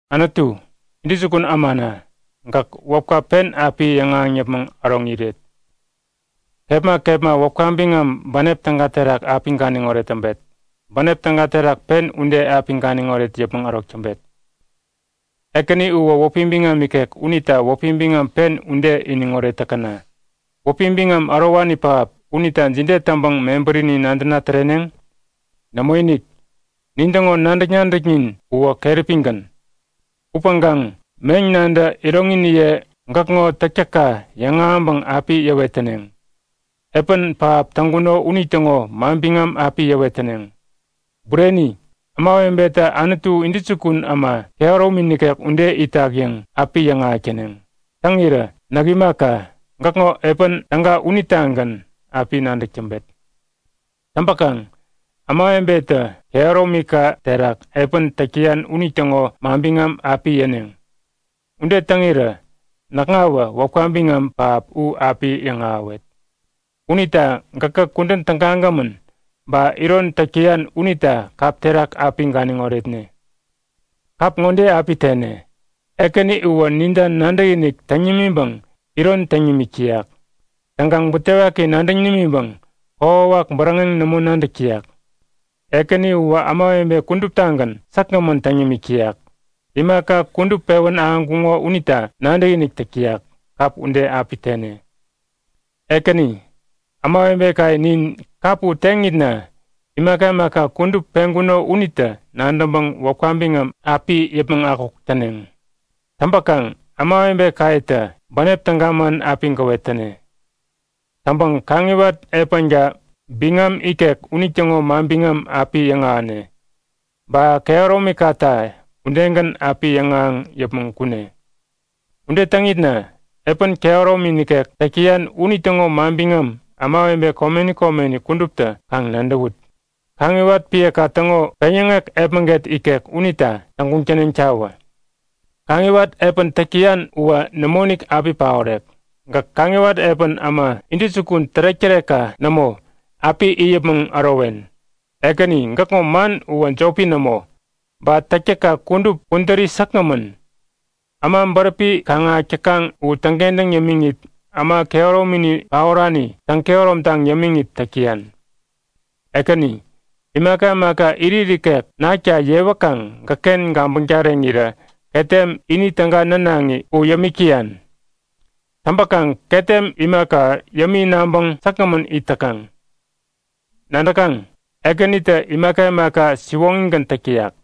Anutu, intäjukun ämana, gäk wäpka pen api yäŋahäŋ yäpmäŋ äroŋ iret. Kepma kepma wäpka biŋam bänep täga terak api ganiŋoret täŋpet. Bänep täga terak pen ude api ganiŋoret yäpmäŋ ärok täŋpet. Ekäni uwä wäpi biŋam ikek unita wäpi biŋam pen ude iniŋoret täkäna! Wäpi biŋam ärowani pähap unita jide täŋpäŋ mebärini nadäna täreneŋ? Nämoinik! Nin täŋo nadäk-nadäknin uwä keräpigän. Upäŋkaŋ meŋ nantä iroŋiniye gäkŋo täktäkka yäŋahäŋpäŋ api yäwet täneŋ. Epän pähap täŋkuno unitäŋo manbiŋam api yäwet täneŋ. Bureni! Ämawebetä Anutu intäjukun äma kehäromi nikek ude itak yäŋ api yäŋahäk täneŋ. Täŋirä näk imaka, gäkŋo epän täga unitagän api nadäk täŋpet. Täŋpäkaŋ ämawebetä kehäromika terak epän täk täyan unitäŋo manbiŋam api yäneŋ. Ude täŋirä näkŋawä wäpka biŋam pähap u api yäŋahäwet. Unita gäkä kudän tägagämän, ba iron täk täyan unita kap terak api ganiŋ oretne. Kap ŋode api tene; Ekäni uwä ninta nadäkinik täŋ nimiŋpäŋ iron täŋ nimik täyak. Täŋkaŋ butewaki nadäŋ nimiŋpäŋ kokwawak bäräŋek nämo nadäk täyak. Ekäni uwä ämawebe kuduptagän säkgämän täŋ yämik täyak. Imaka kudup pewän ahäŋkuŋo unita nadäkinik täk täyak. Kap ude api tene. Ekäni, ämawebekaye nin kap u teŋitna imaka imaka kudup peŋkuno unitä nadäŋpäŋ wäpka biŋam api yäpmäŋ akuk täneŋ. Täŋpäkaŋ ämawebekayetä bänep täga man api gäwet täne. Täŋpäŋ kaŋiwat epänka biŋam ikek unitäŋo manbiŋam api yäŋahäne. Ba kehäromikata udegän api yäŋahäŋ yäpmäŋ kune. Ude täŋitna epän kehäromi nikek täk täyan unitäŋo manbiŋam ämawebe komeni komeni kuduptä kaŋ nadäwut! Kaŋiwat epänka täŋo peŋyäŋek epmäget ikek unita täŋguŋ täneŋtawä! Kaŋiwat epän täk täyan uwä nämoinik api paorek. Gäk kaŋiwat epän äma intäjukun tärek-tärekka nämo api it yämiŋ yäpmäŋ ärowen. Ekäni gäkŋo man uwä jopi nämo. Ba täktäkka kudup kudäri säkgämän. Äma bäräpi kaŋ-ahäk täkaŋ u täŋkentäŋ yämiŋit, äma kehäromini paorani täŋ-kehäromtaŋ yämiŋit täk täyan. Ekäni, imaka imaka irit ikek nakta yewäkaŋ gäkken gabäŋ tareŋirä ketem ini täga nänaŋi u yämik täyan. Täŋpäkaŋ ketem imaka yämi naŋpäŋ säkgämän it täkaŋ. Nadäkaŋ? Ekänitä imaka imaka siwoŋigän täk täyak.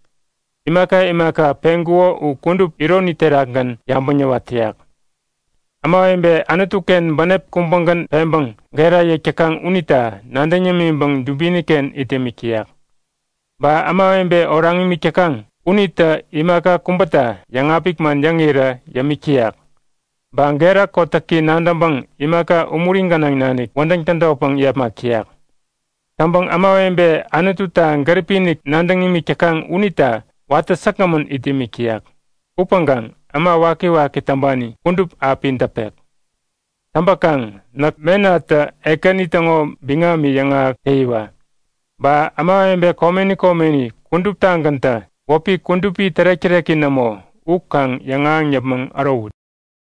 Imaka imaka peŋkuko u kudup ironi terakgän yabäŋ yäwat täyak. Ämawebe Anutuken bänep kubägän peŋpäŋ gera yäk täkaŋ unita nadäŋ yämiŋpäŋ dubiniken it yämik täyak. Ba ämawebe oraŋ imik täkaŋ unitä imaka kubäta yäŋapik man yäŋirä yämik täyak. Ba gera kotäki nadäŋpäŋ imaka umuri gänaŋ nanik wädäŋ tädotpäŋ yepmak täyak. Täŋpäŋ ämawebe Anututa gäripi-inik nadäŋ imik täkaŋ unita watä säkgämän it yämik täyak. Upäŋkaŋ äma wakiwaki täŋpani kudup api däpek. Täŋpäkaŋ näk menatä Ekäni täŋo biŋami yäŋahäk täyiwa! Ba ämawebe komeni komeni kuduptagäntä wäpi kudupi tärek-täreki nämo u kaŋ yäŋahäŋ yäpmäŋ ärowut!